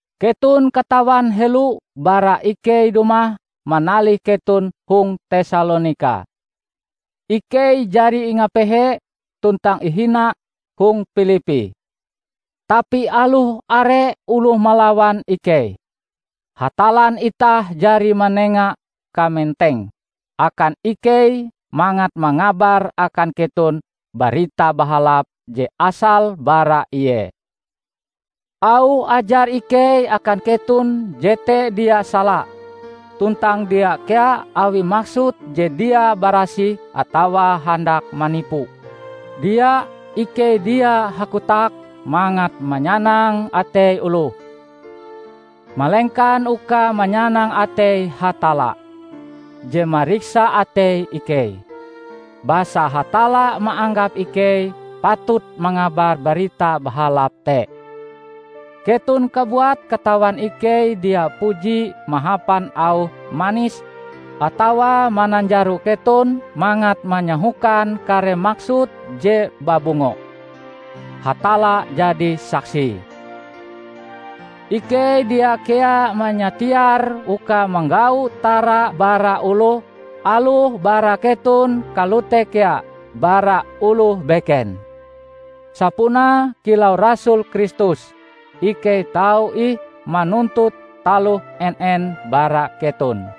Keton katawan helo bara ikei dumah manalih keton hong Tesalonika, ikei jari ingapehe tuntang ihina hong Pilippi. Tapi aloh are oloh malawan ikei, Hatallan itah jari manenga kamenteng akan ikei mangat mangabar akan keton Barita Bahalap je asale bara Ie. Auh ajar ikei akan keton jete dia sala; tuntang dia kea awi maksud je dia barasih atawa handak manipu. Dia! Ikei dia hakotak mangat manyanang atei oloh, malengkan uka manyanang atei Hatalla, je mariksa atei ikei. Basa Hatalla maanggap ikei patut mangabar Barita Bahalap te. Keton kabuat katawan ikei dia puji mahapan auh manis atawa mananjaro keton mangat manyahokan kare maksud je babungo. Hatalla jadi saksie! Ikei dia kea manyatiar uka manggau tara bara oloh -- aloh bara keton kalote kea bara oloh beken. Sapunae kilau rasul Kristus, ikei tau ih manuntut taloh en-en bara keton.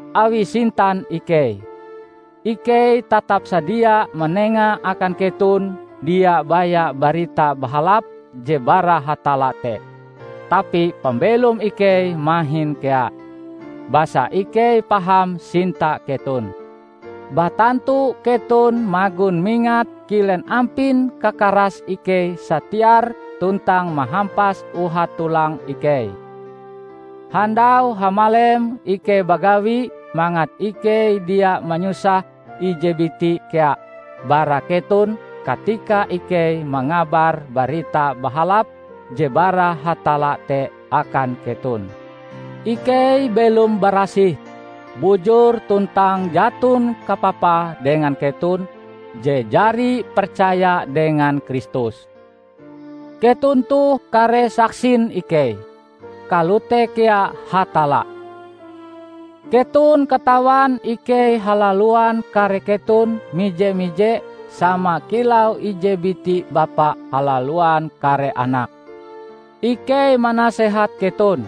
Awi sintan ikei, ikei tatap sadia manenga akan keton dia baya Barita Bahalap je bara Hatalla te, tapi pambelom ikei mahin kea. Basa ikei paham sinta keton! Batantu keton magon mingat kilen ampin kakarase ikei satiar tuntang mahampas uhat-tulang ikei. Handau hamalem ikei bagawi mangat ikei dia manyusah ije biti kea bara keton katika ikei mangabar Barita Bahalap je bara Hatalla te akan keton. Ikei belom barasih, bujur tuntang jaton kapapae dengan keton je jari percaya dengan Kristus. Keton toh kare saksin ikei, kalote kea Hatalla. Keton katawan ikei halaluan kare keton mije-mije sama kilau ije biti bapa halaluan kare anake. Ikei manasehat keton,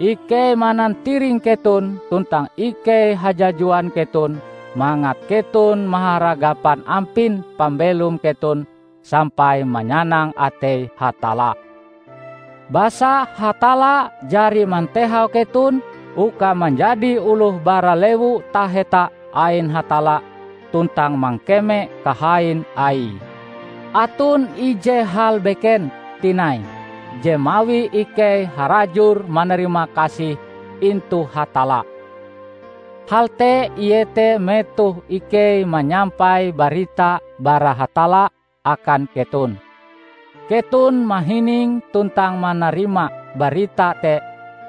ikei manantiring keton tuntang ikei hajajuan keton mangat keton maharagapan ampin pambelom keton sampai manyanang atei Hatalla. Basa Hatalla jari mantehau keton uka manjadi oloh bara Lewu Taheta ain Hatalla tuntang mangkeme kahain Aie. Aton ije hal beken tinai je mawi ikei harajur manarimakasih intu Hatalla. Hal te iete, metoh ikei manyampai barita bara Hatalla akan keton, keton mahining tuntang manarima barita te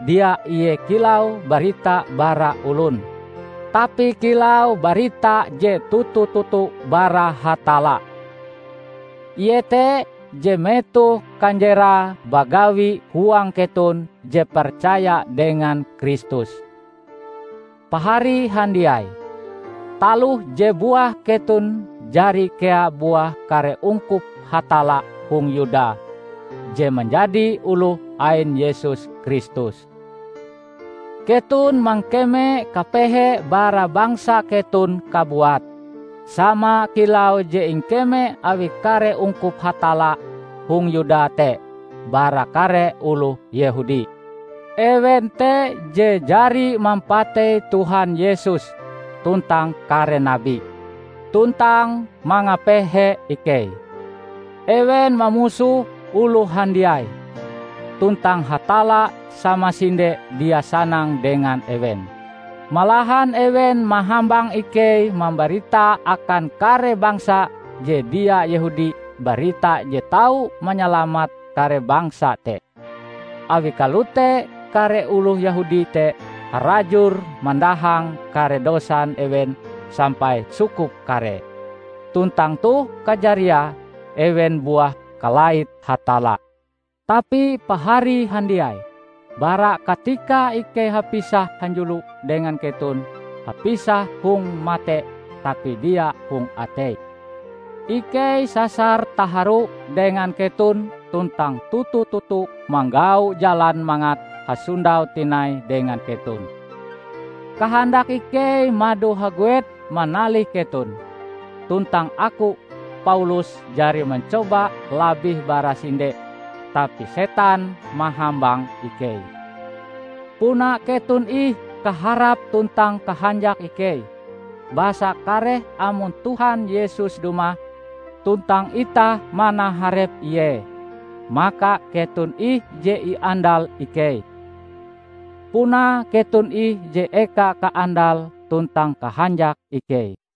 dia ie kilau barita bara olon, tapi kilau barita je toto-toto bara Hatalla. Ie te je metoh kanjerae bagawi huang keton je percaya dengan Kristus. Pahari handiai, taloh je buah keton jari kea buah kare ungkup Hatalla hong Yuda je manjadi oloh ain Yesus Kristus. Keton mangkeme kapehe bara bangsa keton kabuat, sama kilau je ingkeme awi kare ungkup Hatalla hong Yuda te bara kare oloh Yehudi. Ewen te je jari mampatei Tuhan Yesus tuntang kare nabi, tuntang mangapehe ikei. Ewen mamusoh oloh handiai, tuntang Hatalla samasinde dia sanang dengan ewen. Malahan ewen mahambang ikei mambarita akan kare bangsa je dia Yehudi barita je tau manyalamat kare bangsa te. Awi kalote kare oloh Yehudi te harajur mandahang kare dosan ewen sampai sukup karee. Tuntang toh kajariae ewen buah kalait Hatalla! Tapi pahari handiai, bara katika ikei hapisah hanjulo dengan keton -- hapisah hong mate tapi dia hong atei -- ikei sasar taharu dengan keton tuntang toto-toto manggau jalan mangat hasondau tinai dengan keton! Kahandak ikei mado haguet manalih keton; tuntang aku, Paulus, jari mancoba labih bara sinde, tapi setan mahambang ikei. Puna keton ih kaharap tuntang kahanjak ikei. Basa kareh amon Tuhan Yesus dumah, tuntang itah manaharep Ie, maka keton ih je iandal ikei! Puna keton ih je eka kaandal tuntang kahanjak ikei.